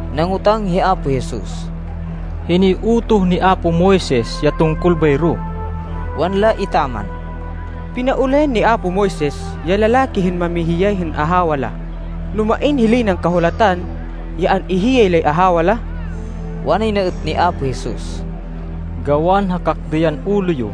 Nangotang hi Apo Jesus, “Hinoy utoh ni apo Moises ya tungkol bayro?” Wanla etaman, “Pinaulayan ni apo Moises ya lalaki hên mamihiyay hên ahawa la no main hilay nan kahulatan ya an-ihiyay lay ahawa la.” Wanay na êt ni Apo Jesus, “Gawan ha kakdêyan ulo yo,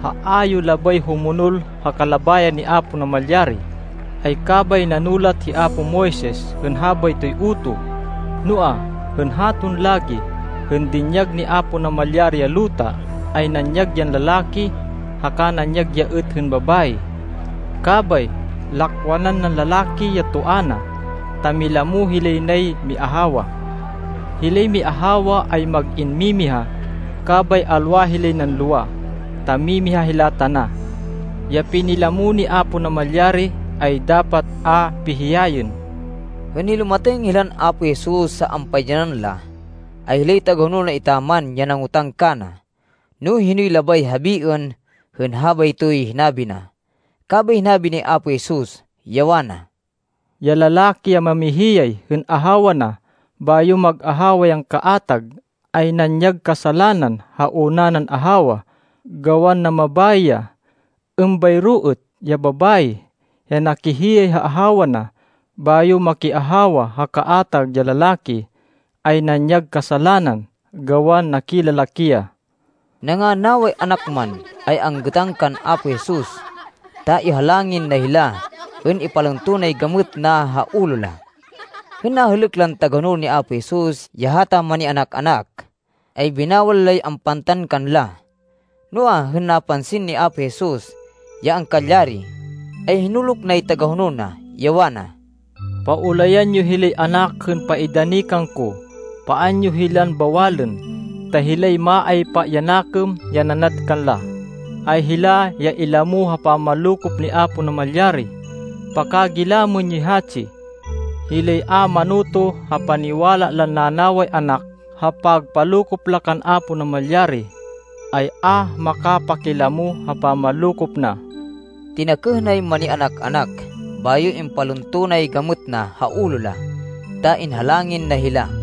ha a yo labay humonol ha kalabayan ni Apo Namalyari, ay kabay nanulat hi apo Moises hên habaytoy utoh. Noa, hên haton lagi, hên dinyag ni Apo Namalyari ya luta, ay nanyag yan lalaki, haka nanyag ya êt hên babayi. Kabay lakwanan nan lalaki ya toa na, ta milamo hilay nay miahawa. Hilay miahawa ay mag-in mimiha, kabay alwa hilay nan lowa, ta mimiha hila tana. Ya pinilamo ni Apo Namalyari, ay dapat a pihiyayên.” Hên nilumatêng hilan Apo Jesus ha ampaidyanan la, ay hilay tagahonol na etaman ya nangotang kana, no hinoy labay habiên hên habaytoy hinabi na. Kabay hinabi ni Apo Jesus, ya wana, “Ya lalaki ya mamihiyay hên ahawa na, bayo mag-ahawa yan kaatag, ay nanyag kasalanan ha una nan ahawa gawan namabayi ya. Êmbayro êt ya babayi ya nakihiyay ha ahawa na, bayo makiahawa ha kaatag ya lalaki, ay nanyag kasalanan gawan nakilalaki ya.” Nanganaway anak man, ay anggêtan kan Apo Jesus, ta ihalangin na hila hên ipalunto nay gamêt na ha ulo la. Hên nahêlêk lan tagahonol ni Apo Jesus ya hata manianak-anak, ay binawal lay ampantan kanla. Noa, hên napansin ni Apo Jesus, ya angkalyari, ay hinuluk nay tagahonol na, ya wana, “Paulayan yo hilay anak hên paidani kangko. Paan yo hilan bawalên. Ta hilay maaypa ya nakêm ya nanad kanla, ay hila ya ilamo ha pamanlokop ni Apo Namalyari. Pakagilamên yoy hatsi. Hilay a manoto ha paniwala lan nanaway anak ha pagpalokop la kan Apo Namalyari, ay a makapakilamo ha pamanlokop na.” Tinakêh nay manianak-anak, bayo impalunto nay gamêt na ha ulo la, ta inhalangin na hila.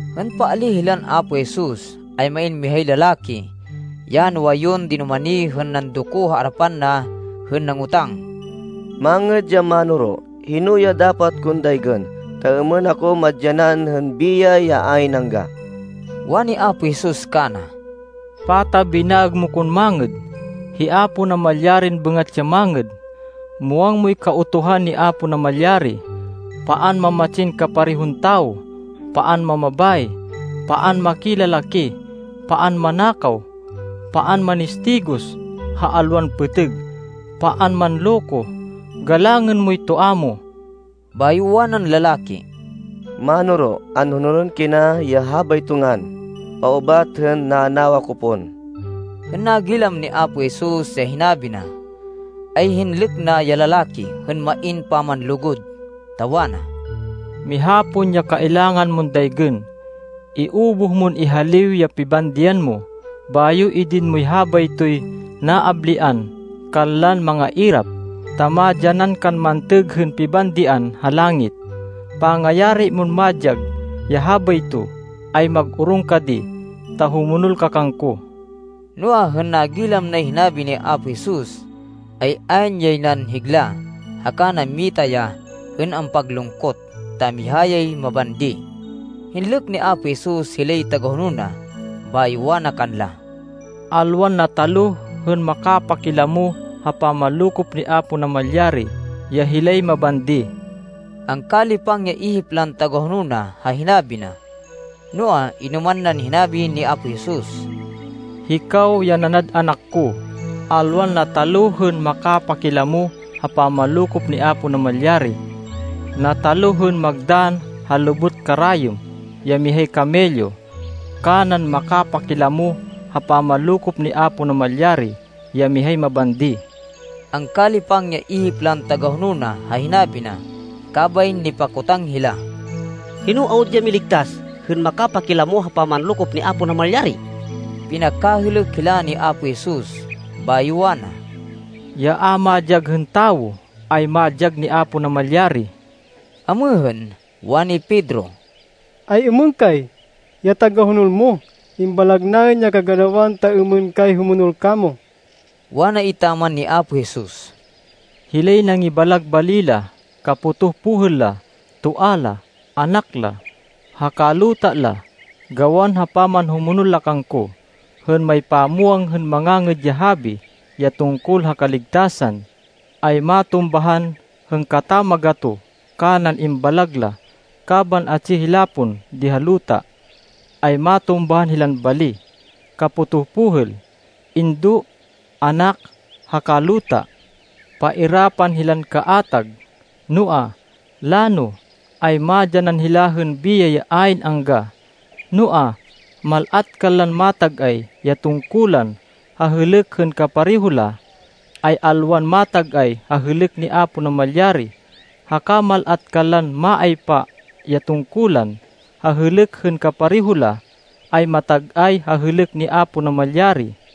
Hên paalíh hilan Apo Jesus, ay main mihay lalaki ya nuwayun dinumani hên nandoko ha arapan na hên nangotang, “Mangêd ya Mánoro, hino ya dapat kon daygên, ta êmên ako madyanan hên biyay ya ayn angga?” Wani Apo Jesus kana, “Pata binaêg mo kon mangêd? Hi Apo Namalyarin bêngat ya mangêd. Muwang moy Kautuhan ni Apo Namalyari, ‘Paan mamatsin kaparehon tawo. Paan mamabayi. Paan makilalaki. Paan manakaw. Paan manistigos ha alwan pêtêg. Paan manloko. Galangên moy toa mo.’” Bayo wanan lalaki, “Mánoro, anhonolên kina ya habayto ngan, paubat hên nanawa ko pon.” Hên nagilam ni Apo Jesus ya hinabi na, ay hinlêk na ya lalaki hên main pamanlugud, ta wana, “Miha pon ya kailangan mon daygên. Iubuh mon ihaliw ya pibandian mo, bayo idin moy habaytoy naablian kanlan mangairap, ta madyanan kan mantêg hên pibandian ha langit. Pangayari mon madyag ya habayto, ay mag-orong ka di, ta humonol ka kangko.” Noa, hên nagilam nay hinabi ni Apo Jesus, ay ayn yay nan higla haka nammita ya hên ampaglungkot, ta miha yay mabandi. Hinlêk ni Apo Jesus hilay tagahonol na, bayo wana kanla, “Alwan nataluh hên makapakilamo ha pamanlokop ni Apo Namalyari ya hilay mabandi!” Angkalipang ya ihip lan tagahonol na ha hinabi na. Noa, inoman nan hinabi ni Apo Jesus, “Hikaw ya nanad anak ko, alwan nataluh hên makapakilamo ha pamanlokop ni Apo Namalyari! Nataluh hên magdann ha lubot karayêm ya mihay kamelyo, kanan makapakilamo ha pamanlokop ni Apo Namalyari ya mihay mabandi.” Angkalipang ya ihip lan tagahonol na ha hinabi na, kabay nipakotang hila, “Hino awud ya miligtas, hên makapakilamo ha pamanlokop ni Apo Namalyari?” Pinakahêlêk hila ni Apo Jesus, bayo wana, “Ya a madyag hên tawo, ay madyag ni Apo Namalyari.” Amêhên, wani Pedro, “Ay-êmên kay, ya tagahonol mo? Imbalag naên ya kaganawan, ta êmên kay humonol kamo.” Wana etaman ni Apo Jesus, “Hilay nangibalag bali la, kapotoh pohêl la, toa la, anak la, haka luta la, gawan ha pamanhumonol la kangko, hên maypamwang hên Mangangêd ya Habi ya tungkol ha kaligtasan, ay matumbahan hên katamagatoh kanan imbalag la. Kaban atsi hila pon di ha luta, ay matumbahan hilan bali, kapotoh pohêl, indo, anak haka luta. Pairapan hilan kaatag, noa, lano, ay madyanan hila hên biyay ya ayn angga. Noa, mal-at kanlan matag-ay ya tungkulan ha hêlêk hên kapareho la, ay alwan matag-ay ha hêlêk ni Apo Namalyari, haka mal-at kanlan maaypa ya tungkulan ha hêlêk hên kapareho la, ay matag-ay ha hêlêk ni Apo Namalyari.”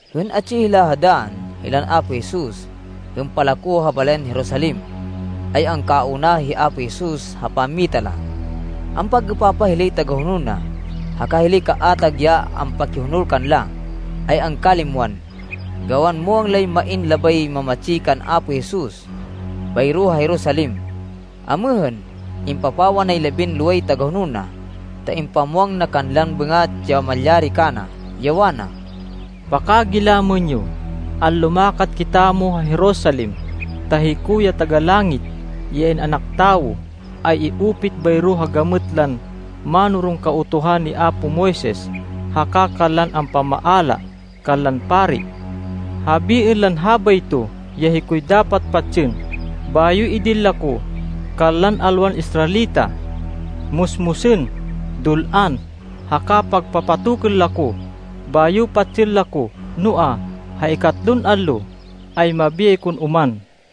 Hên atsi hila ha dann, hilan Apo Jesus, hên palako ha balayan Jerusalem, ay angkauna hi Apo Jesus ha pammita la. Ampag-êpapah hilay tagahonol na, haka hilay kaatag ya ampakihonol kanla, ay angkalimwan, gawan muwang lay main labay mamatsi kan Apo Jesus bayro ha Jerusalem. Amêhên, impapawa nay labinloway tagahonol na, ta impamwang na kanlan bêngat ya malyari kana, ya wana, “Pakagilamên yo! Anlumakat kitamo ha Jerusalem ta hiko, ya Taga-Langit, ya In-anak Tawo ay i-upit bayro ha gamêt lan mánoron Kautuhan ni apo Moises, haka kanlan ampamaala kanlan pari. Habiên lan habayto ya hikoy dapat patsên, bayo idin la ko kanlan alwan Israelita. Musmusên, dul-an, haka pagpapatokên la ko, bayo patsên la ko. Noa, ha ikatlon allo, ay mabiyay kon oman!”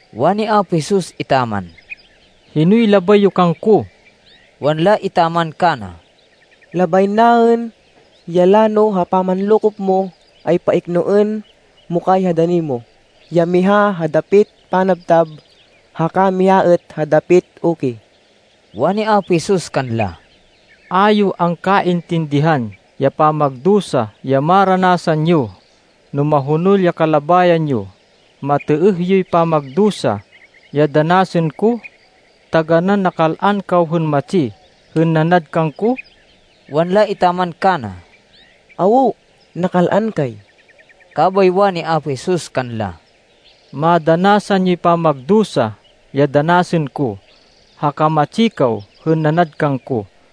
Wani Apo Jesus etaman, “Hinoy labay yo kangko?” Wanla etaman kana, “Labay naên, ya lano ha pamanlokop mo, ay paiknoên mo kay ha dani mo, ya miha ha dapit panabtab, haka miha êt ha dapit uki.” Wani Apo Jesus kanla, “A yo angkaintindihan ya pamagdusa ya maranasan yo, no mahonol ya kalabayan yo. Matêêh yoy pamagdusa ya danasên ko? Taganán nakal-an kaw hên matsi hên nanad kangko?” Wanla etaman kana, “Awo. Nakal-an kay.” Kabay wani Apo Jesus kanla, “Madanasan yoy pamagdusa ya danasên ko, haka matsi kaw hên nanad kangko.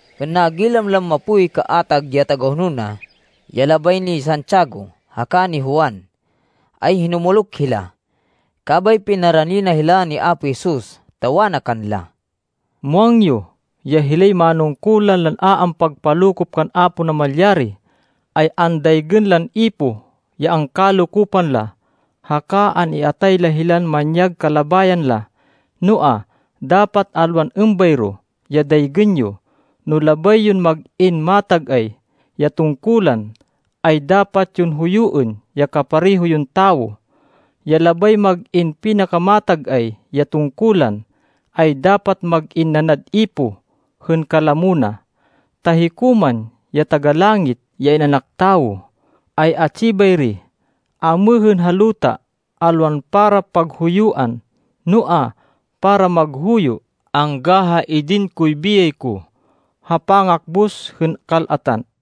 Hên nagilam lan mapoy kaatag ya tagahonol na, ya labay ni Santiago haka ni Juan, ay hinumuluk hila. Kabay pinarani na hila ni Apo Jesus, ta wana kanla, “Muwang yo ya hilay manungkulan lan a ampagpalokop kan Apo Namalyari, ay andaygên lan ipoh ya angkalokopan la, haka an-iatay la hilan manyag kalabayan la. Noa, dapat alwan êmbayro ya daygên yo. No labay yon mag-in matag-ay ya tungkulan, ay dapat yon huyuên ya kapareho yon tawo. Ya labay mag-in pinakamatag-ay ya tungkulan, ay dapat mag-in nanad ipoh hên kalamo na. Ta hiko man ya Taga-Langit, ya In-anak Tawo, ay atsi bayri amêhên ha luta, alwan para paghuyuan, noa, para maghuyo angga ha idin koy biyay ko, ha pangakbus hên kal-atan.”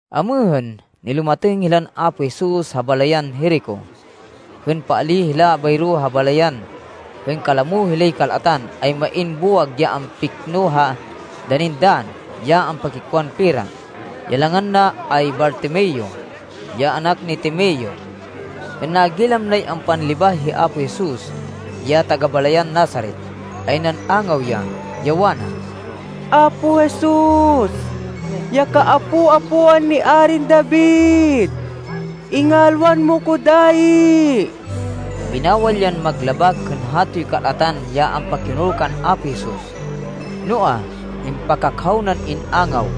Amêhên, nilumatêng hilan Apo Jesus ha balayan Jerico. Hên paalíh hila bayro ha balayan, hên kalamo hilay kal-atan, ay main buwag ya ampikno ha danin dann, ya ampakikwan pera. Ya langan na ay Bartimeo, ya anak ni Timeo. Hên nagilam nay ampanlibah hi Apo Jesus ya taga-balayan Nazaret, ay nan-angaw ya, ya wana, “Apo Jesus, ya kaapo-apoan ni Arin David, ingalwan mo ko dayi!” Binawal yan maglabak hên hatoy kal-atan ya ampakihonol kan Apo Jesus, noa, impakakhaw nan in-angaw,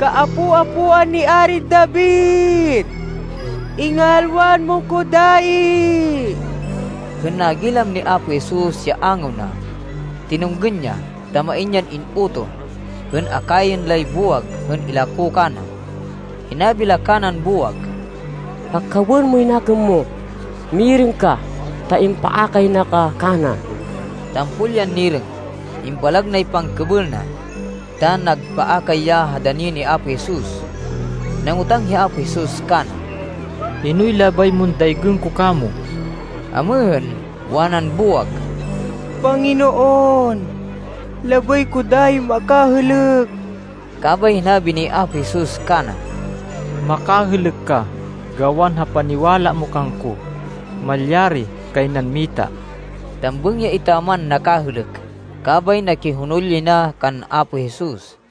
“Kaapo-apoan ni Arin David, ingalwan mo ko dayi!” Hên nagilam ni Apo Jesus ya angaw na, tinunggên ya, ta main yan in-utoh, hên akayên lay buwag hên ilako kana. Hinabi la kanan buwag, “Pakhawên moy nakêm mo! Mirêng ka ta impaakay na ka kana.” Tampol yan nirêng. Imbalag nay pangkêbêl na, ta nagpaakay ya ha dani ni Apo Jesus. Nangotang hi Apo Jesus kana, “Hinoy labay mon daygên ko kamo?” Amêhên, wanan buwag, “Panginoon, labay ko dayin makahêlêk.” Kabay hinabi ni Apo Jesus kana, “Makahêlêk ka, gawan ha paniwala mo kangko. Malyari kay nan mita.” Tambêng ya etaman nakahêlêk, kabay nakihonol yay na kan Apo Jesus.